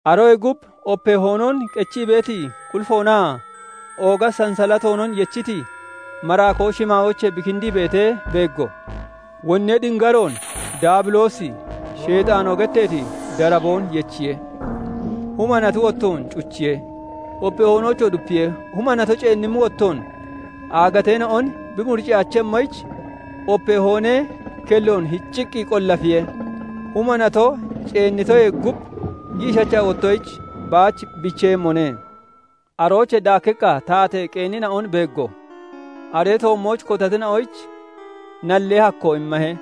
Aroyee gub opee hoonoon qechii beeti qulifoonaa ooga sansalatoonon yechiti maraakoo shimaayoochee bi kindii beetee beeggo. Wonnee dingaroon, Daabiloosi, Sheexaanoo getteeti daraboon yechiye; huma nati wottoon cuchiye; opee hoonoochoo dupiye; huma nato ceennimmi wottoon aagateena'on bi muricciyaachemmoyich, opee hoonee kelloon hicciqqi qollafiye; huma nato ceennitoyee gub giishacha wottoyich baach biicheeyemmone. Aroochee daakkiqqa taatee qeenina'on beeggo; aree toommooch kotatina'oyich nallee hakkoo immahe;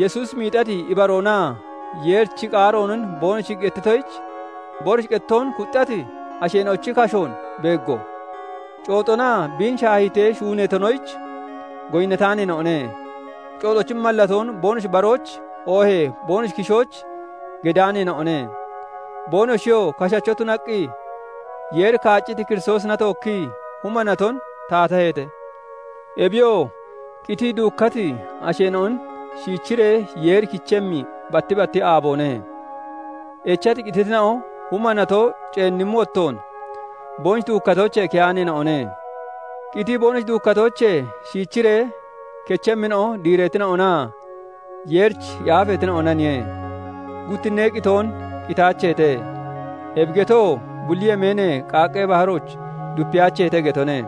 Yesuusi miixati ibaroonaa Yeerichi qaaroonon boonoshi gettitoyich boonoshi qettoon kuxxati asheena'ochi kashoon beeggo; cooxonaa biin shaahiitee shuuneetonoyich goyinnataaneena'one; cooxochi mallatoon boonoshi barooch oohee boonoshi kishooch gedaaneena'one. Boonoshiyoo kashacho tunaqqi Yeeri kaacciti Kiristoosina tookkii huma naton taataheete. Ebiyoo qitii duukkati asheena'on shiichiree Yeeri kichemmi batti batti aaboone. Echati qititina'o huma nato ceennimmi wottoon boonoshi duukkatoochee keyaaneena'one. Qitii boonoshi duukkatoochee shiichiree kechemmina'o diireetina'onaa Yeerich yaafeetina'onaniye; guttinnee qitoon qitaacheete; ebi getoo bulli yemeenee qaaqqee baharooch dupeyaacheete getone;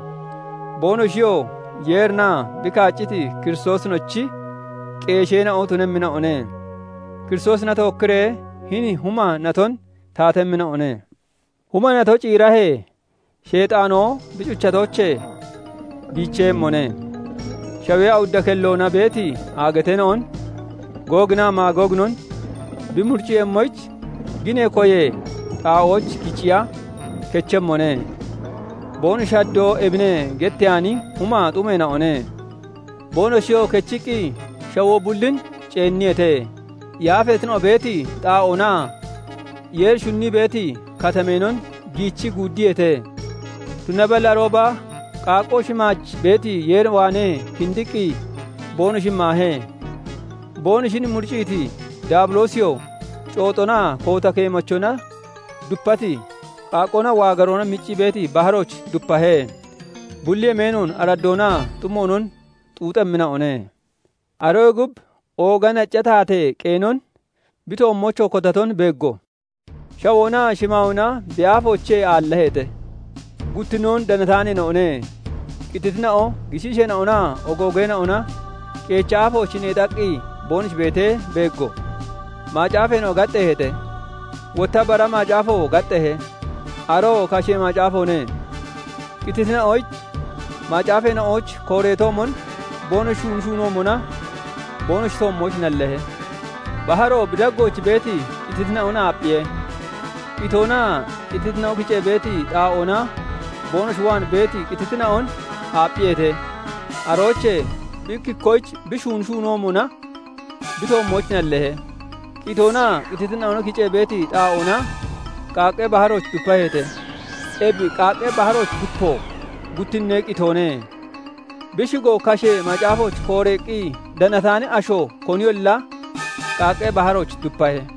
boonoshiyoo Yeerinaa bi kaacciti Kiristoosinochi qeesheena'o tunemmina'one; Kiristoosina tookkiree hini huma naton taatemmina'one. Huma nato ciirahee, Sheexaanoo bi cuchatoochee biicheeyemmone; shawee awudda kelloona beeti aagateena'on, Googinaa Maagooginon bi muricciiyemmoyich ginee koyee xaa'ooch kiciya kechemmone; boonoshi haddoo "Ebine" getteyaani humaa xumeena'one. Boonoshiyoo kechiqqi shawoo bullin ceenniyeete; yaafeetina'o beeti xaa'oonaa Yeeri shunnii beeti katameenon giichii guuddiyeete; tunaballi arooba qaaqqoo shimaaj beeti Yeer waanee kindiqqi boonoshin maahe. Boonoshin muricciiti Daabiloosiyoo, cooxonaa koota keemachona dupati, qaaqqoonaa waagaroona miccii beeti baharooch dupahe; bulli yemeenoon araddoonaa xumoonon xuuxemmina'one. Aroyee gub ooga nacca taatee qeenon, bi toommoochoo kotaton beeggo; shawoonaa shimaayoona bi aafoochee aallaheete; guttinnoon danataaneena'one. Qititina'o, gishiisheena'onaa ogoogeena'ona qeechi aafooch neexaqqi boonoshi beetee beeggo; macaafeena'o gaxxeeheete; wotta bara macaafoo gaxxeehe; aroo kashee macaafoone; qititina'oyich macaafeena'ooch kooreetoomon boonoshi shuuni shuunoomona boonoshi toommooch nalleehe. Baharo bi daggooch beeti qititina'on aapphiye; qitoonaa qititina'o kicee beeti xaa'oona boonoshi waan beeti qititina'on aapphiyeete; aroochee bi ikki ikkoyich bi shuuni shuunoomona bi toommooch nalleehe. Qitoonaa qititina'o kicee beeti xaa'oona qaaqqee baharooch dupaheete; ebi qaaqqee baharooch dupo guttinnee qitoone. Bi shigoo kashee macaafooch kooreeqqi danataani asho koniyolla qaaqqee baharooch dupahe.